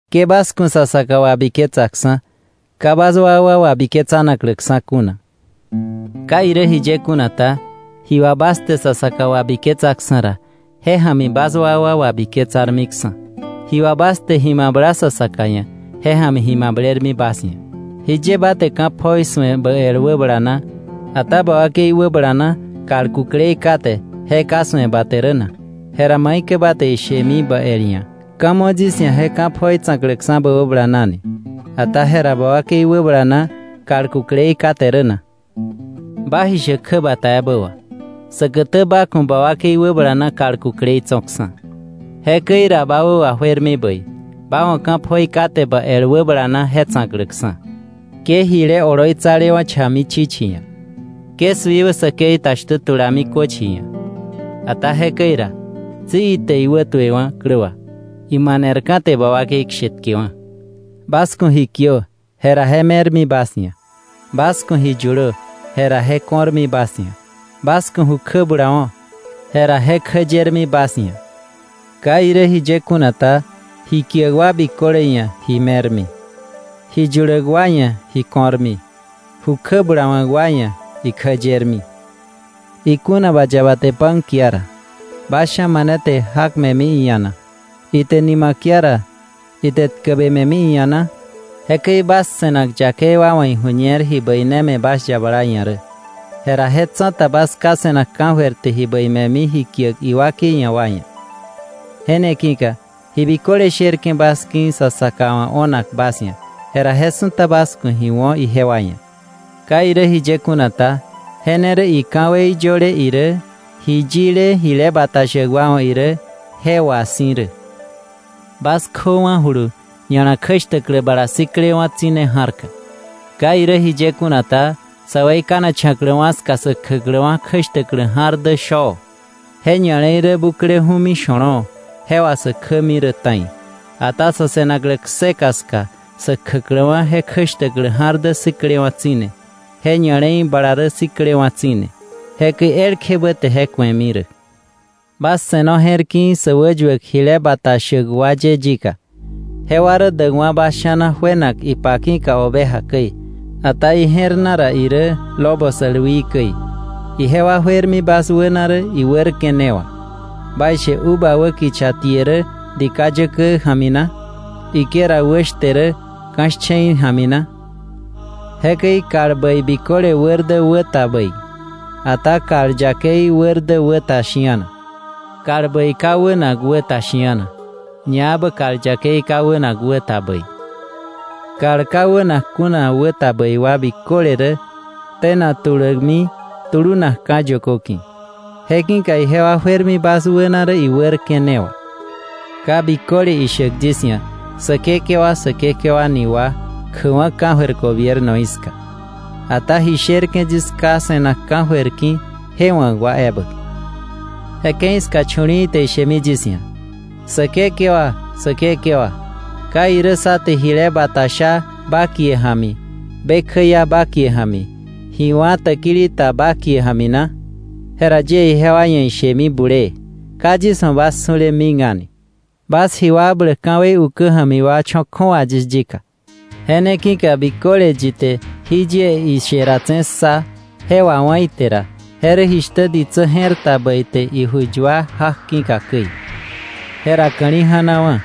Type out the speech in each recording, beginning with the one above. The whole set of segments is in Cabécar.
“Ke bas ku̱ sa saka wabiketsaksa̱, ka bas wakwa wabiketsanakläksa̱ kuna. Ka irä jiye kuna ta, ji wà bas te sa saka wabiketsaksa̱ ra, je ja̱mi bas wakwa wabiketsarmiksa̱. Ji wà bas te ji mabla sa saka ia̱, je ja̱mi ji mablermi bas ia̱. ¿Jiye ba te ka̱ pjoi su̱e bä el wäbala na, ata ba wakei wäbala na kal kuklei kate je ka su̱e ba te rä na? Jera ¿maikäi ba te ishemi bä el ia̱: ‘Ka̱ mo yis ia̱ je ka̱ pjoi tsa̱kläksa̱ bä wäbala na’ ni, ata jera ba wakei wäbala na kal kuklei kate rä na? Ba ji shäk kjäbata ebä wà, säkätä ba ku̱ ba wakei wäbala na kal kuklei tso̱ksa̱. Jekäi ra ba wä wajuermi bäi, ba wa̱ ka̱ pjoi kate bä el wäbala na je tsa̱kläksa̱. “Ke jile oloitsalewa̱ cha̱mi chichi ia̱, ke suiwä säkei ta shtä tulami köchi ia̱. Ata jekäi ra, tsi ite iwätuewa̱ klä wà, imanerka̱ te ba wakei kshetkewa̱. “Bas ku̱ ji kiö, jera je me̱rmi bas ia̱; bas ku̱ ji yulö, jera je ko̱rmi bas ia̱; bas ku̱ ju kjä bulawo̱, jera je kjä yermi bas ia̱. Ka irä jiye kuna ta, ji kiäk wa biköle ia̱ ji me̱rmi; ji yuläk wa ia̱ ji ko̱rmi; ju kjä bulawa̱k wa ia̱ ikjä yermi. “Ikuna ba yaba te pan kia ra, ¿bas sha̱ mane te jak me̱mi iia̱ na? Ite nima kia ra, ite tkäbe me̱mi iia̱ na? Jekäi bas se̱nak yakei wa wa̱ iju̱ñer ji bäi ne me̱ bas yabala ia̱ rä, jera je tsa̱ta bas Ká se̱nak ka̱jöir te ji bäi me̱mi ji kiäk iwakei ia̱ wa ia̱. “Je ne ki̱ka ji biköle sherke̱ bas ki̱ sa saka wa̱ o̱nak bas ia̱, jera je su̱ta bas ku̱ ji wo̱ ijewa ia̱. Ka irä jiye kuna ta, je ne rä ika̱wei yöle irä, ji yile jile bata shäk wa wa̱ irä, je wà si̱ rä. “Bas kjöwa̱julu ña̱la kjäshtäklä bala siklewa̱ tsi̱ne ja̱rka. Ka irä jiye kuna ta, sä weikanacha̱kläwa̱ ska sä kjäkläwa̱ kjäshtäklä ja̱r dä shoo, je ña̱le̱i rä bukleju̱mi sho̱lo̱o̱; je wà sä kjämi rä ta̱i. Ata sa̱ se̱naklä kseka ska sä kjäkläwa̱ je kjäshtäklä ja̱r dä siklewa̱ tsi̱ne, je ña̱le̱i bala rä siklewa̱ tsi̱ne; jekäi elkjebä te je ku̱emi rä. “Bas se̱no je̱r ki̱i̱ sä wäyuäk jile bata shäk wa ye yika. Jewa rä däkwa̱ bas sha̱na juenak ipa ki̱ oveja käi, ata ije̱r na ra irä lobo sälwii käi. Ijewa juermi bas wäna rä iwärke̱ ne wà. ¿Baishe uva wä kicha tie rä dika yäkä ja̱mi na? ¿Higuera wä shte rä ka̱ shche̱i ja̱mi na? Jekäi kal bäi biköle wär dä wä ta bäi, ata kal yakei wär dä wä ta shi̱ana. Kal bäi ka wänak wä ta shi̱ana, ñaebä kal yakei ka wänak wä ta bäi. Kal ka wänak kuna wä ta bäi wa biköle rä tenak tulämi tulunakka̱ yökö ki̱. Je ki̱ka ijewa juermi bas wäna rä iwärke̱ ne wà. “Ka biköle ishäk yis ia̱: ‘Säkekewa, Säkekewa’ ni wa, kjäkwa̱ ka̱jöir gobiernoí ska. Ata ji sherke̱ yis Ká se̱nak ka̱jöir ki̱ je wa̱k wa ebä. Je ke̱i ska, chu̱li̱i̱ te ishemi yis ia̱: ‘Säkekewa Säkekewa, ¿ka irä sá te jile bata sha ba kie ja̱mi, be kjäia ba kie ja̱mi, ji wá̱ täkili ta ba kie ja̱mi na?’ Jera yie ijewa ia̱ ishemi bulee: ‘Ka yis wa̱ bas su̱le mik a̱ni. ¡Bas ji wakbläk ka̱wei ukä ja̱mi wa, cho̱ kju̱awa yis yika!’ “Je ne ki̱ka biköle yi te jí yie ishe datse̱ ssa, je wawá̱ ite ra, je rä jishtä ditsä je̱r ta bäi te iju yua jak ki̱ka käi. Jera ka̱li̱ ja̱nawa̱,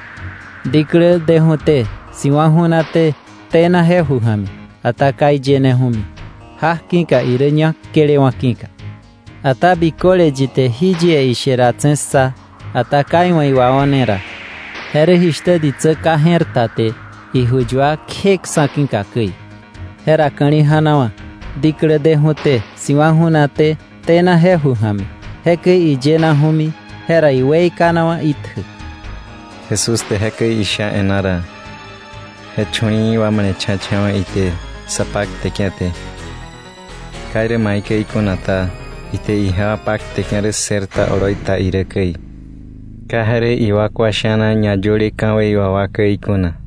diklä deju̱té, si̱wa̱ ju̱naté tena je ju ja̱mi, ata ka iyeneju̱mi, jak ki̱ irä ñak tkelewa̱ ki̱ka. Ata biköle yi te jí yie ishe datse̱ ssa, ata ka iwa̱ iwao̱ne ra, je rä jishtä ditsä ka je̱r ta te iju yua kje ksa̱ ki̱ka käi. Jera ka̱li̱ ja̱nawa̱, diklä deju̱té, siwa̱ ju̱naté, tena je ju ja̱mi; jekäi iyenaju̱mi, jera weikanawa̱ itjä.” Jesús te jekäi isha e̱ná ra, je chu̱li̱i̱ wa male̱cha̱cha̱wa̱ ite sa pakteke̱ te. Ka irä maikäi kuna ta, ite ijewa pakteke̱ rä ssër ta oloi ta irä käi; ka je rä iwakwa sha̱na ñayöle ka̱wei wà wa käi kuna.